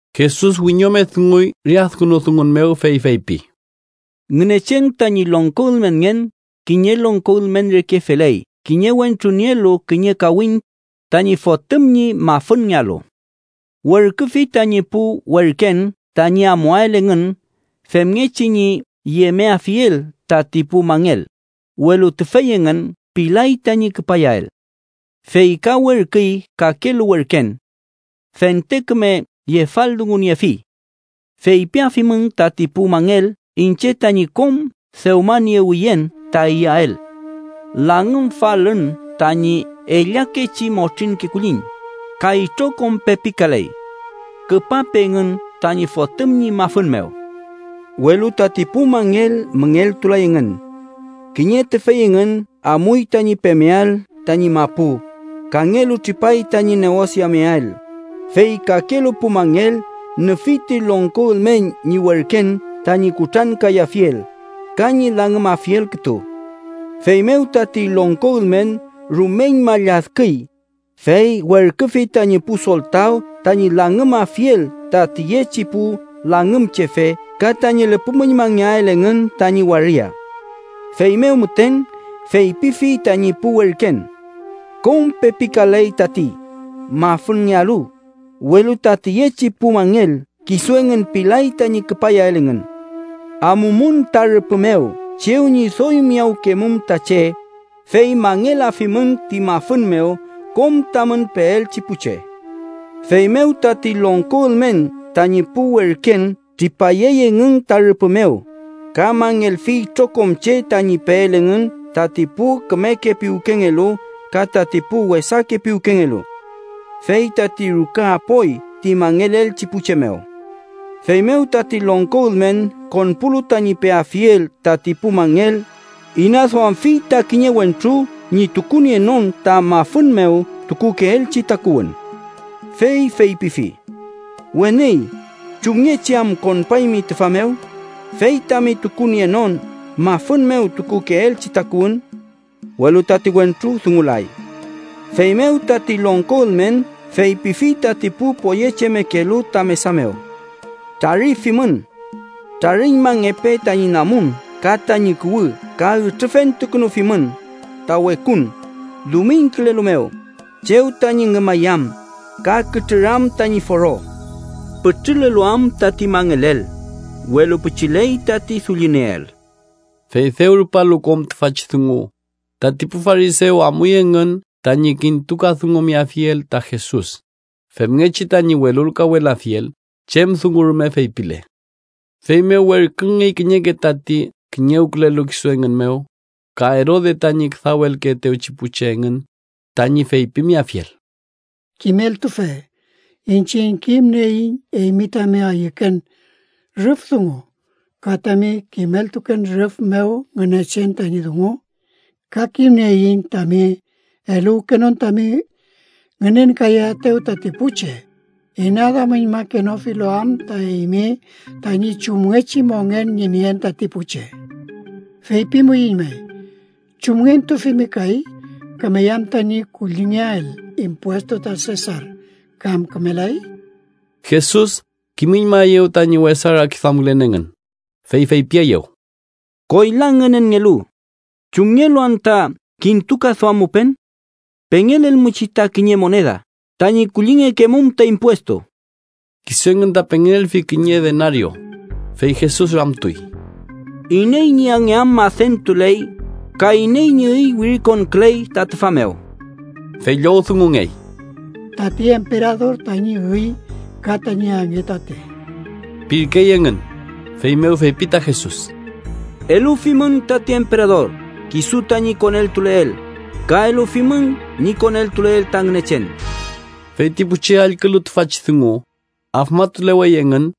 Jesus wiñome dunguy re adkünu dungu mew, fey feypi: “Ngünechen tañi longko ülmenngen kiñe longko ülmen reke feley kiñe wentru nielu kiñe kawiñ tañi fotüm ñi mafünngealu. Werküfi tañi pu werken tañi amuael engün femngechi ñi yemeafiel tati pu mangel, welu tüfey engün pilay tañi küpayael. Fey ka werküy kakelu werken. Fente küme yefaldunguyefi: ‘Feypiafimün tati pu mangel iñche tañi kom dewmaniewiyen ta iyael. Langümfalün tañi ellakechi motrinke kulliñ, ka itrokom pepikaley. Küpape engün tañi fotüm ñi mafün mew.’ “Welu tati pu mangel müngeltulay engün. Kiñe tüfey engün amuy tañi pemeael tañi mapu, kangelu tripay tañi neosiameael, fey kakelu pu mangel nüfi ti longko ülmen ñi werken tañi kutrankayafiel ka ñi langümafiel kütu. Feymew tati longko ülmen rumeñma lladküy, fey werküfi tañi pu soltaw tañi langümafiel ta tiyechi pu langümchefe ka tañi lüpümüñmangeael engün tañi waria. “Feymew müten feypifi tañi pu werken: ‘Kom pepikaley tati mafünngealu, welu ta tiyechi pu mangel kisu engün pilay tañi küpayael engün. Amumün ta rüpü mew chew ñi doy miyawkemum ta che, fey mangelafimün ti mafün mew kom tamün peelchi pu che.’ Feymew tati longko ülmen tañi pu werken tripayey engün ta rüpü mew, ka mangelfi itrokom che tañi peel engün tati pu kümeke piwkengelu ka tati pu wesake piwkengelu. Fey tati ruka apoy ti mangelelchi pu che mew. “Feymew tati longko ülmen konpulu tañi peafiel tati pu mangel, inaduamfi ta kiñe wentru ñi tukunienon ta mafün mew tukukeelchi takuwün. Fey feypifi: ‘Weni, ¿chumngechi am konpaymi tüfa mew, fey tami tukunienon mafün mew tukukeelchi takuwün?’ Welu tati wentru dungulay. “Feymew tati longko ülmen feypifi tati pu poyechemekelu ta mesa mew: ‘Trarifimün. Trariñmangepe tañi namun ka tañi kuwü ka ütrüfentukünufimün ta wekun dumiñkülelu mew, chew tañi ngümayam ka kütrüram tañi foro’ pütrülelu am tati mangelel, welu pichiley tati dullinieel.” Fey dew rupalu kom tüfachi dungu, tati pu farisew amuy engün tañi kintukadungumeafiel ta Jesus femngechi tañi welulkawelafiel chem dungu rume feypile. Feymew werküngey kiñeke tati kiñewkülelu kisu engün mew, ka Erode tañi küdawelkeetewchi pu che engün, tañi feypimeafiel: —Kimeltufe, iñchiñ kimnieiñ eymi tami ayüken rüf dungu ka tami kimeltuken rüf mew Ngünechen tañi dungu. Ka kimnieiñ tami eluwkenon tami ngünenkayaetew tati pu che, inaduamüñmakenofilu am ta eymi tañi chumngechi mongen ñi nien tati pu che. Feypimuiñ may: ¿Chumngentufimi kay? ¿Kümey am tañi kullingeael impuestu ta Sesar, kam kümelay? Jesus kimüñmaeyew tañi wesa rakiduamkülen engün, fey feypieyew: —Koyla ngünenngelu, ¿chumngelu anta kintukaduammupen? Pengelelmuchi ta kiñe moneda tañi kullingekemum ta impuestu. Kisu engün ta pengelelfi kiñe denario, fey Jesus ramtuy: —¿Iney ñi ange am adentuley ka iney ñi üy wirintukuley ta tüfa mew? Fey llowdungungey: —Tati emperador tañi üy ka tañi ange tatey ―pirkey engün. Feymew feypi ta Jesus: —Elufimün tati emperador kisu tañi koneltuleel, ka elufimün ñi koneltuleel ta Ngünechen. Fey ti pu che allkülu tüfachi dungu, afmatulewey engün.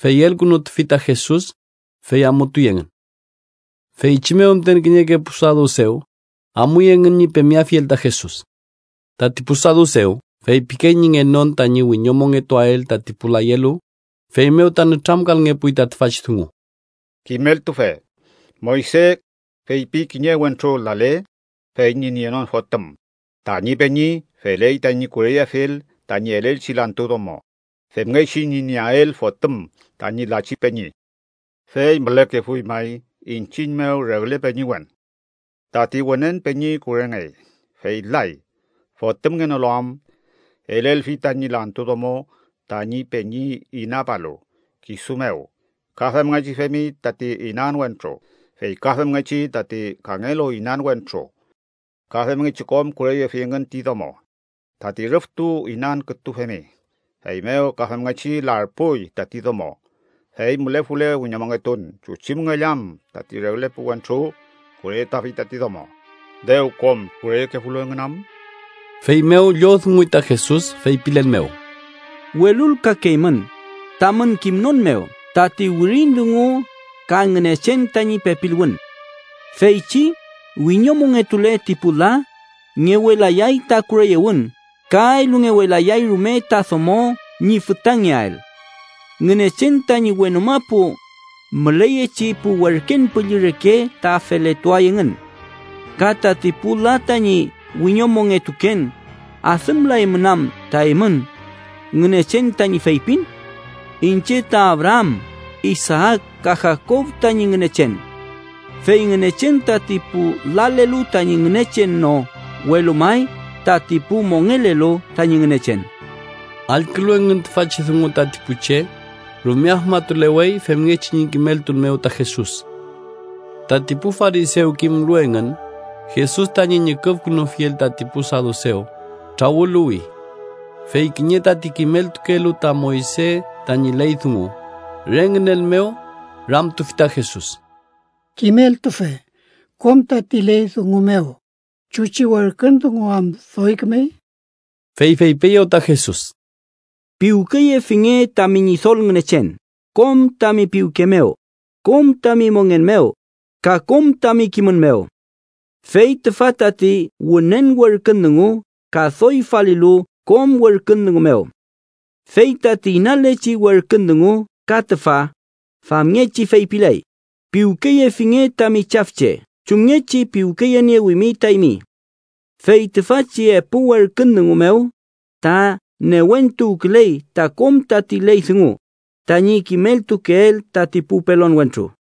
Fey elkünutufi ta Jesus, fey amutuy engün. Feychi mew müten, kiñeke pu sadusew amuy engün ñi pemeafiel ta Jesus. Tati pu sadusew feypikey ñi ngenon tañi wiñomongetuael tati pu layelu, feymew ta nütramkalngepuy ta tüfachi dungu: —Kimeltufe, Moyse feypi kiñe wentru lale fey ñi nienon fotüm, tañi peñi feley tañi kureyeafiel tañi elelchi lantu domo, femngechi ñi nieael fotüm tañi lachi peñi. Fey mülekefuy may iñchiñ mew regle peñiwen. Tati wünen peñi kurengey, fey lay. Fotümngenolu am, elelfi tañi lantu domo tañi peñi inapalu kisu mew. Ka femngechi femi tati inan wentru, fey ka femngechi tati kangelu inan wentru, ka femngechi kom kureyefi engün ti domo. Tati rüftu inan kütu femi. Feymew ka femngechi larpuy tati domo. Fey mülefule wiñomongetun, ¿chuchi müngell am tati regle pu wentru kureyetuafi tati domo, dew kom kureyekefulu engün am? Feymew llowdunguy ta Jesus, feypilen mew: —Welulkakeymün, tamün kimnon mew tati wirin dungu ka Ngünechen tañi pepiluwün. Feychi wiñomongetule ti pu la, ngewelayay ta kureyewün ka elungewelayay rume ta domo ñi fütangeael. Ngünechen tañi wenu mapu müleyechi pu werken püllü reke ta feletuay engün. Ka tati pu la tañi wiñomongetuken, ¿adümlaymün anta eymün Ngünechen tañi feypin: ‘Iñche ta Abraam, Isaak ka Jakob tañi Ngünechen’? ¡Fey Ngünechen tati pu lalelu tañi Ngünechen no, welu may tati pu mongelelu tañi Ngünechen! Allkülu engün tüfachi dungu, tati pu che rume afmatulewey femngechi ñi kimeltun mew ta Jesus. Tati pu farisew, kimlu engün Jesus tañi ñüküfkünufiel tati pu sadusew, trawüluwi. Fey kiñe tati kimeltukelu ta Moyse tañi ley dungu, re ngünen mew, ramtufi ta Jesus: —Kimeltufe, kom tati ley dungu mew, ¿chuchi werkün dungu am doy kümey? Fey feypieyew ta Jesus: “Piwkeyefinge tami Ñidol Ngünechen kom tami piwke mew, kom tami mongen mew, ka kom tami kimün mew.” Fey tüfa tati wünen werkün dungu ka doy falilu kom werkün dungu mew. Fey tati inalechi werkün dungu ka tüfa famngechi feypiley: “Piwkeyefinge tami chafche chumngechi piwkeyeniewimi ta eymi.” Fey tüfachi epu werkün dungu mew ta newentuwküley ta kom tati ley dungu tañi kimeltukeel tati pu pelon wentru.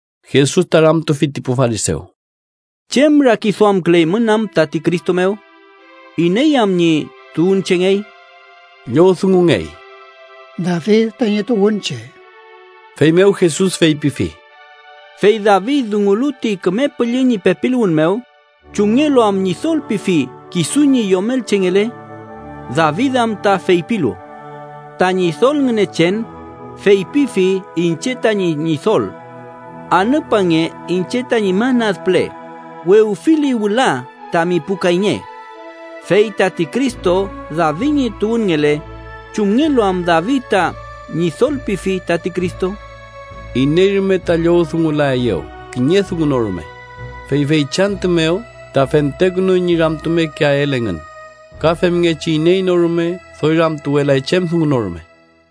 Jesus ta ramtufi ti pu farisew: —¿Chem rakiduamküleymün am tati Cristo mew? ¿Iney am ñi tuwünchengey? Llowdungungey: —David tañi tuwünche. Feymew Jesus feypifi: —¿Fey David, dungulu ti Küme Püllü ñi pepiluwün mew, chumngelu am Ñidol pifi kisu ñi yomelchengele? David am ta feypilu: ‘Ta Ñidol Ngünechen feypifi iñche tañi Ñidol: Anüpange iñche tañi man ad püle, wewfili wüla tami pu kayñe.’ Fey ¿tati Cristo David ñi tuwünngele, chumngelu am David ta Ñidol pifi tati Cristo? Iney rume ta llowdungulaeyew kiñe dungu no rume, fey feychi antü mew ta fentekünuy ñi ramtumekeael engün, ka femngechi iney no rume doy ramtuwelay chem dungu no rume.